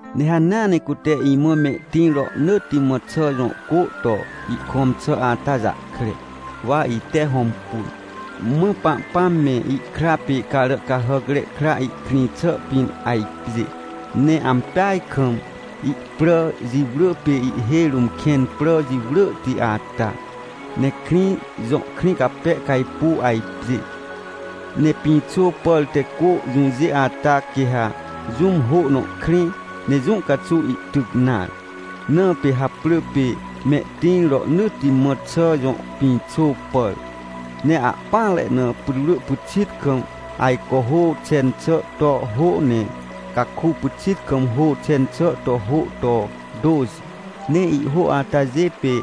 Ne hanea ne cute imã mehtĩr rohnỳtti mã xà jõ cô to ihkõm xà ata jahkre, wa ite hõmpun. Mã Pahpãm me, ihkra pê Caràcahàcre Kra ihkrĩ xàa pĩn ajpjê, ne ampeaj kam ihprà jiwrỳ, pê ihhêj rũm kẽn prà jiwrỳhti ata, ne krĩ jõ krĩ cape cajpuw ajpjê. Ne pĩxô pàr te cô jũjê ata, quê ha jũm hô nõ krẽ, ne jũ caxuw ihtyc nare, na pê haprỳ pê Mehtĩr Rohnỳtti Mã Xà Jõ Pĩxô Pàr. Ne ahpỹanre na putwrỳ pyxit kam ajco hô xen xà to hô. Ne caku pyxit kam hô xen xà to hô to tôxi. Ne ihhô atajê pê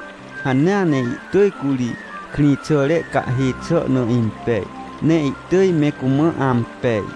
hanea ne ihtỳj curi krĩxàre cahhê xà na impej, ne ihtỳj me cumã ampej.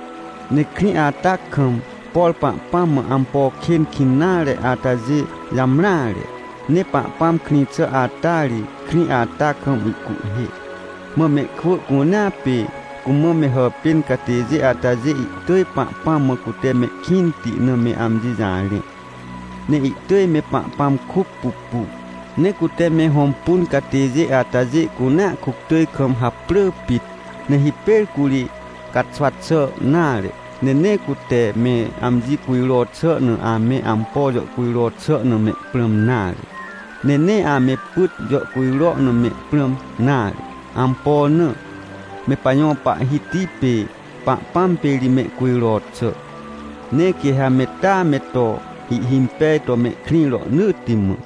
Ne krĩ ata kam, por Pahpãm mã ampo kên kĩn nare atajê jamreare. Ne Pahpãm krĩ xà ata ri, krĩ ata kam ihcuhhê. Mã mehkwỳ cunea pê cumã me hàpên catêjê atajê ihtỳj Pahpãm mã cute mehkĩnti na me amji jarẽ. Ne ihtỳj me Pahpãm kuc pupu, ne cute me hõmpun catêjê atajê cunea kuctỳj kam haprỳ pit. Ne hipêr curi caxwa xà nare, ne nee cute me amji cujro xà na ame ampo jàhcujro xà na me prãm nare, ne nee ame pyt jàhcujro na me prãm nare. Ampo na? Me pajõ Pahhiti pê Pahpãm pê ri mehcujro xà, ne quê ha me taa me to ihhimpej to mehkrĩ rohnỳtti mã.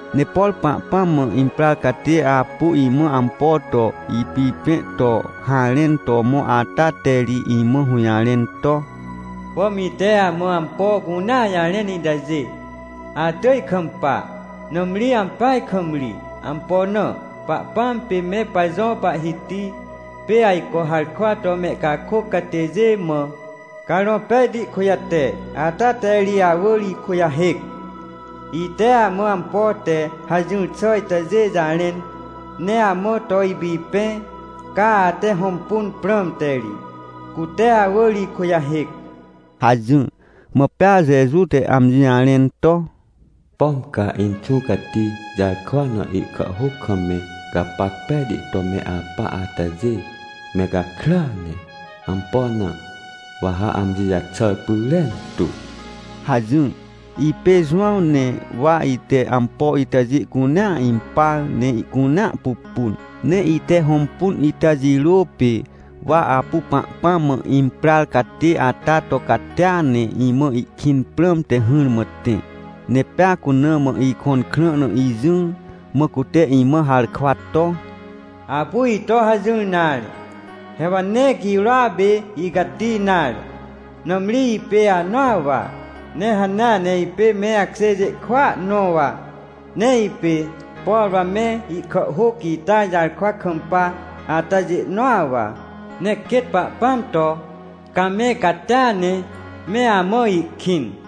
Ne por Pahpãm mã imprar catê apu imã ampo to ipipẽ to harẽn to mõ ata te ri imã hũjarẽn to: — Pom ite amã ampo cunea jarẽn itajê, atỳj kampa, nãmri ampeaj kam ri. Ampo na? Pahpãm pê me pajõ Pahhiti, pê ajco harkwa to mehcakôc catêjê mã Carõ Pejti kujate, ata te ri awỳr ikujahêc. Ite amã ampo te hajỹr xà itajê jarẽn, ne amã to ipipẽ, ca ate hõmpun prãmte ri, cute awỳr ikujahêc — hajỹr. Mã pea Jeju te amji jarẽn to: — Pom ca Inxũ Cati jarkwa na ihkàhhôc kam me gapac pejti to me apa atajê, me gakrya ne. Ampo na? Wa ha amji jaxàr pyrentu — hajỹr. Ipê Jowãw, ne wa ite ampo itajê cunea impar, ne ihcunea pupun. Ne ite hõmpun ita jirô pê, wa apu Pahpãm mã imprar catê ata to catia ne imã ihkĩn prãmte hỹrmã tẽ, ne pea cuna mã ikõn krã na ijỹr, mã cute imã harkwa to: — Apu ito hajỹr nare. He wa nee girôa pê icati nare, nãmri ipê anõa wa, ne hanea ne ipê me akjêjê kwỳa nõ wa, ne ipê, por wa me ihkàhhôc ita jarkwa kampa atajê nõa wa. Ne quêt Pahpãm to ca me catia ne me amã ihkĩn.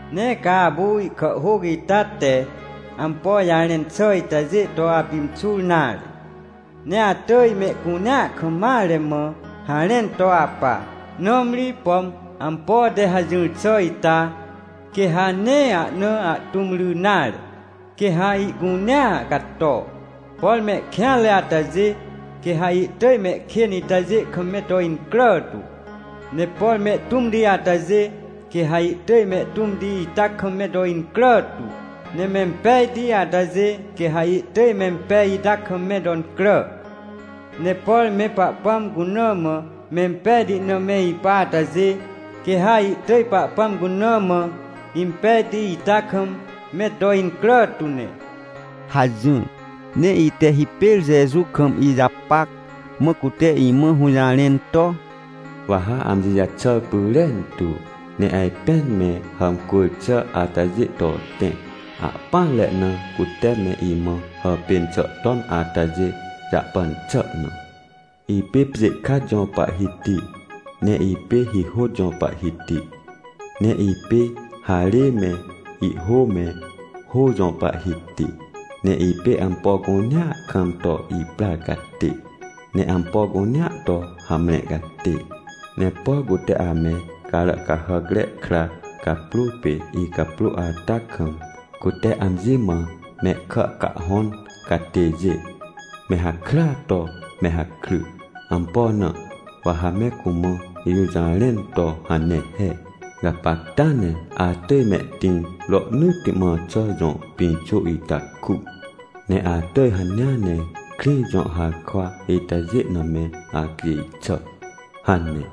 — Nee ca apu ihkàhhôc ita te ampo jarẽn xà itajê to apimxur nare, ne atỳj mehcunea kam mare mã harẽn to apa. Nãmri, pom ampo te hajỹr xà ita, quê ha nee ahna ahtũm ry nare, quê ha ihcunea cato. Por mehkêanre atajê, quê ha ihtỳj mehkên itajê kam me to incrà tu, ne por mehtũmti atajê, quê ha ihtỳj mehtũmti ita kam me to incrà tu. Ne mempejti atajê, quê ha ihtỳj mempej ita kam me to incrà. Ne por me Pahpãm cuna mã mempejti na me ipa atajê, quê ha ihtỳj Pahpãm cuna mã impejti ita kam me to incrà tu ne — hajỹr. Ne ite hipêr Jeju kam ijapac, mã cute imã hũjarẽn to: — Wa ha amji jaxàr pyrentu! Ne ajpên me hàmcwỳr xà atajê to tẽ, ahpỹanre na cute me imã hàpên xà ton atajê jahpan xà na. Ipê pjê kat jõ Pahhiti, ne ipê hihôt jõ Pahhiti. Ne ipê harê me, ihhô me, hô jõ Pahhiti. Ne ipê ampo cunea kam to iprar catê, ne ampo cunea to hamre catê. — Ne por cute ame Caràcahàcre Kra caprô pê icaprô ata kam, cute amji mã mehkà cahhõn catêjê, me hakrya to me hakry. Ampo na wa ha me cumã ijũjarẽn to hane he: —“Gapacta ne atỳj Mehtĩr Rohnỳtti Mã Xà Jõ Pĩxô ita ku, ne atỳj hanea ne krĩ jõ harkwa itajê na me acjêj xà” hane.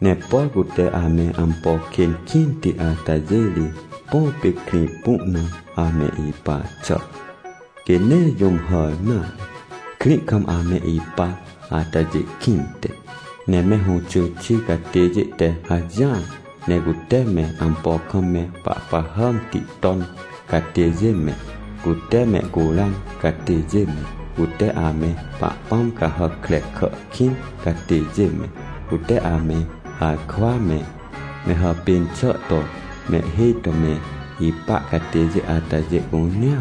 Ne por cute ame ampo kên kĩnti atajê ri, põ pê krĩ pu na ame ipa xà, quê nee jũm hàr nare, krĩ kam ame ipa atajê kĩnte. Ne me hũxy xi catêjê te hajỹar, ne cute me ampo kam me pahpahàmti ton catêjê me, cute mehcuran catêjê me, cute ame pahpãm cahàc krekà kĩn catêjê me, cute ame harkwa me, me hàpên xà to mehhêj to me ipa catêjê atajê cunea,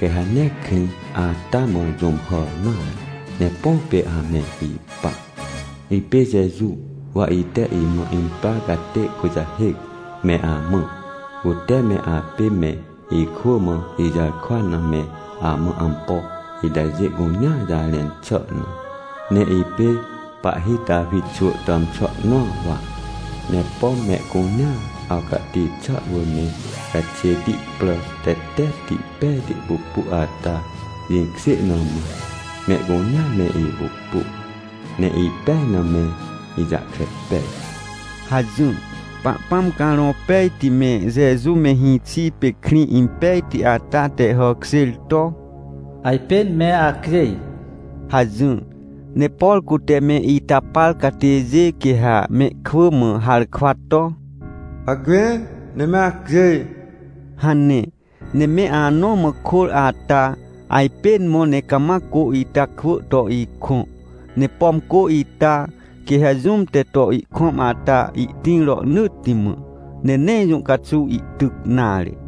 quê ha nee krĩ ata mã jũm hàr nare, ne põ pê ame ipa. — Ipê Jeju, wa ite imã imprar catê kujahêc me amã, cute me apê me ikwỳ mã ijarkwa na me amã ampo itajê cunea jarẽn xà na. Ne ipê pahhi Tawi xwỳ tàmxwỳ nõa wa. Ne pom mehcunea awcahti xà wỳr me caxêti prà tetetti pejti pupu ata jĩkjê na mã, mehcunea me ipupu ne ipej na me ijahkre pej — hajỹr. Pahpãm Carõ Pejti me Jeju me hĩxi pê krĩ impejti ata te hàkjêr to: — Ajpên me acjêj — hajỹr. Ne por cute me ita par catêjê, quê ha mehkwỳ mã harkwa to: — Hacme, ne me acjêj! — hane. Ne me anõ mã kôr ata, ajpên mõ ne cama cô ita kwỳ to ikõ. Ne pom cô ita, quê ha jũm te to ihkõm ata ihtĩr rohnỳtti mã, ne nee jũ caxuw ihtyc nare.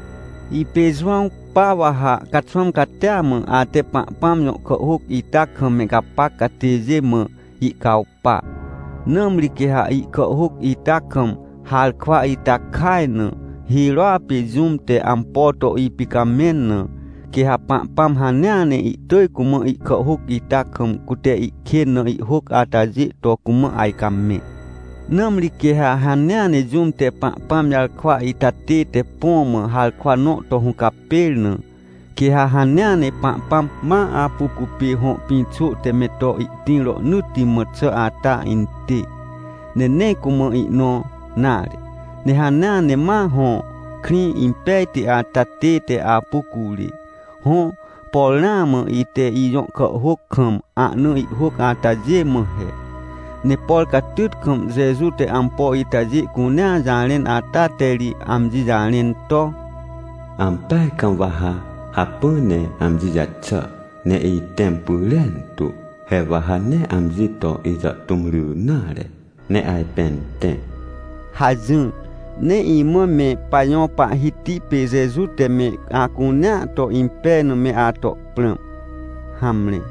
Ipê Jowãw, pa wa ha caxwãm catia mã ate Pahpãm jõ kàhhôc ita kam me gapac catêjê mã ihcawpa. Nãmri quê ha ihkàhhôc ita kam harkwa ita kaj na, hirôa pê jũm te ampo to ipicamẽn na, quê ha Pahpãm hanea ne ihtỳj cumã ihkàhhôc ita kam, cute ihkên na ihhôc atajê to cumã ajcamẽ. Nãmri quê ha hanea ne jũm te Pahpãm jarkwa ita tête, põ mã harkwa nõ to hũcapêr na, quê ha hanea ne Pahpãm ma apu cupê hõ pĩxô te me to ihtĩr rohnỳtti mã xà ata intê, ne nee cumã ihnõ nare, ne hanea ne ma hõ krĩ impejti ata tête apu curê. Hõ, por ramã ite ijõ kàhhôc kam ahna ihhôc atajê mã he. Ne por catyt kam Jeju te ampo itajê cunea jarẽn ata te ri amji jarẽn to: — Ampeaj kam wa ha hacpỹ ne amji jaxàr ne itẽm pyrentu, he wa ha nee amji to ijàhtũm ry nare, ne ajpên tẽ — hajỹr. Ne imã me Pajõ Pahhiti pê Jeju te me acunea to impej na me ato prãm. Hamre.